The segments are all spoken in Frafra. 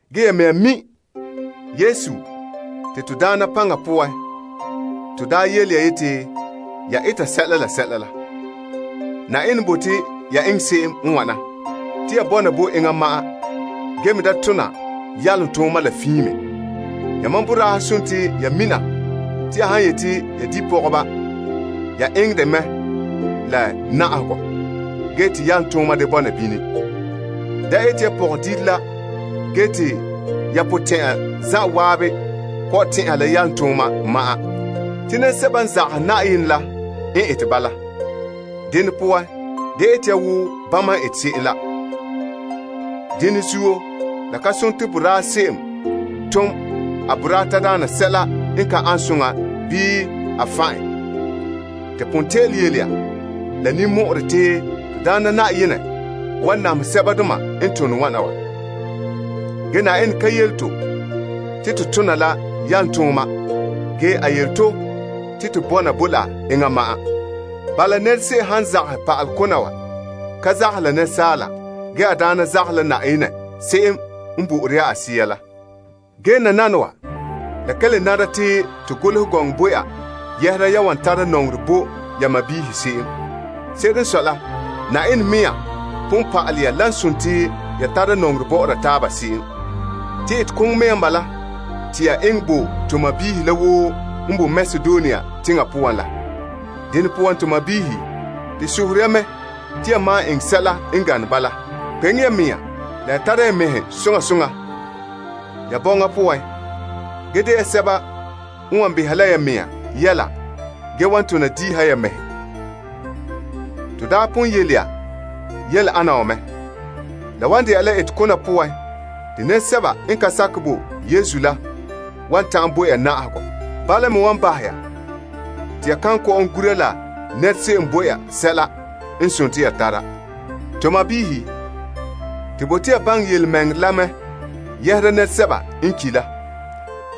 Ge ya mɛŋa mi' Na'ayenɛ Yesu paŋa poan to daa yele ya te eta sɛla la. Yenɛ n bote ya eŋɛ se'em n wana, te ya bɔna bo enŋa ma'an ge me da tona yalomtooma la fiin me. Yamam boraahe dela ya mina te ya han yeti ya di' pɔgɔba, ya eŋɛ dɛ mɛ la na'ahegɔ ge te yalomtooma da bɔna bini. Da ete ya pɔgɔdire la ge te ya potɛn'ɛra zan'an kɔ'ɔn tɛn'ɛha la yalomtooma ma'an. Te nɛresɛba n zagahɛ Yenɛ la n ete bala. Dene poan, da ete ya wo bama n ete se'em la. Dene zuo, la ka dela boraa se'em tom a boraa tadaana sɛla n ka ane soŋa bii a fan' en. To pon te'ele yele ya la ninmɔ'ɔrɛ te Na'ayenɛ wan namehɛ sɛbadoma n tone wana wa. Ge Yenɛ ka yele to te to tona la yalomtooma, ge a yele to te to bɔna bo la enŋa ma'an. Bala, se'em woo n zagahɛ pa'ale kona wa ka zagahɛ la asaala. Ge, a daana zagahɛ la Yenɛ se'em n bo'ore ya a Sea la. Ge nananawa, la ka dene te to golehɛ gɔŋɔ bo ya yɛhera yan wan tara nɔŋerɛ bo ya sɔɔnrɔ se'em. Se'ere n sɔe la, Yenɛ mɛŋa pon pa'alɛ ya te ya tara nɔŋerɛ bɔ'ɔra taaba se'em. Te etekoŋɔ mɛŋa n bala, te ya eŋɛ bo to sɔɔnrɔ la woo n boe Makedonia teŋa poan la. Dene poan to sɔɔnrɔ, to sohore ya mɛ te ya malom eŋɛ sɛla n gane bala. Kpeŋe ya mɛŋa la ya tara ya mɛhe soŋa soŋa ya bɔŋa poan ge de ya sɛba n wan beha la ya mɛŋa yɛla ge wan tona diiha ya mɛhe, wo ton daa pon yele ya se'em la. La wan dɛna la etekona poan te nɛresɛba n ka sakɛ bo Yesu la wan ta'an bo ya na'ahegɔ. Bala me wan bahɛ ya te ya kan kɔ'ɔn gura la nɛra se'em bo ya sɛla n dela ya tara. To sɔɔnrɔ, to bote ya baŋɛ yelemɛŋɛrɛ la mɛ yɛhera nɛresɛba n ki' la.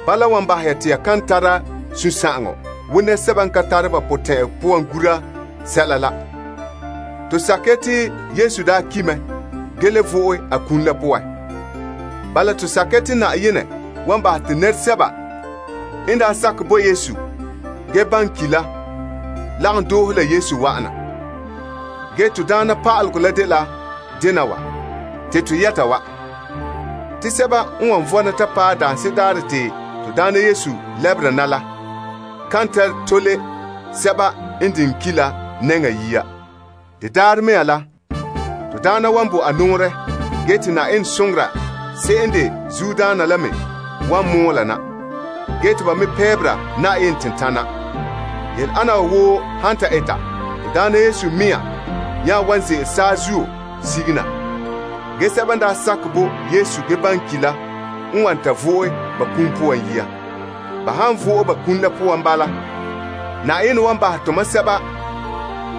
Bala n wan bahɛ ya te ya kan tara sunsagaŋɔ wo nɛresɛba n ka tare ba potɛn'ɛra poan gura sɛla la. To sakɛ ya te Yesu daa ki' mɛ ge le vo'e a kum la poan. Bala to sakɛ ya te Yenɛ wan bahɛ te nɛresɛba n daa sakɛ bo Yesu ge ki' la wan vo'e bɔna la Yesu. Ge Na'ayenɛ mɛŋa yelehom te yele ya wa, te sɛba n wan vɔna ta paɛ daanse'ere daarɛ te Na'ayenɛ lɛbera na la kan ta tole sɛba n diŋɛ ki' la yia. De daarɛ mea la, Na'ayenɛ wan bo a nɔɔrɛ, ge te Yenɛ soŋora se'em n de zuodaana la me wan mɔɔla na, ge te ba me pɛɛbera Yenɛ tentanɛ. Yele ana wa woo han ta eta, Na'ayenɛ mɛŋa me nya wan ze'ele saazuo sige na. Ge sɛba n daa sakɛ bo Krista ge ki' la n wan ta vo'e ba kum poan yia. Ba han vo'e ba kum la poan bala, Yenɛ wan bahɛ tomam sɛba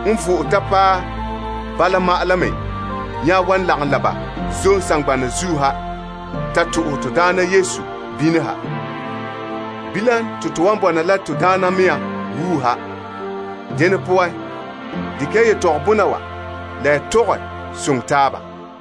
n vo'e ta paɛ bala ma'an la me nya wan lagom la ba zom saŋgbana zuo ha ta to'ohɛ Na'ayenɛ, to nya wan bɔna la Na'ayenɛ la wuuha. Dene poan, dekɛ ya yetɔgɔbɔna wa la ya tɔgɛ soŋɛ taaba.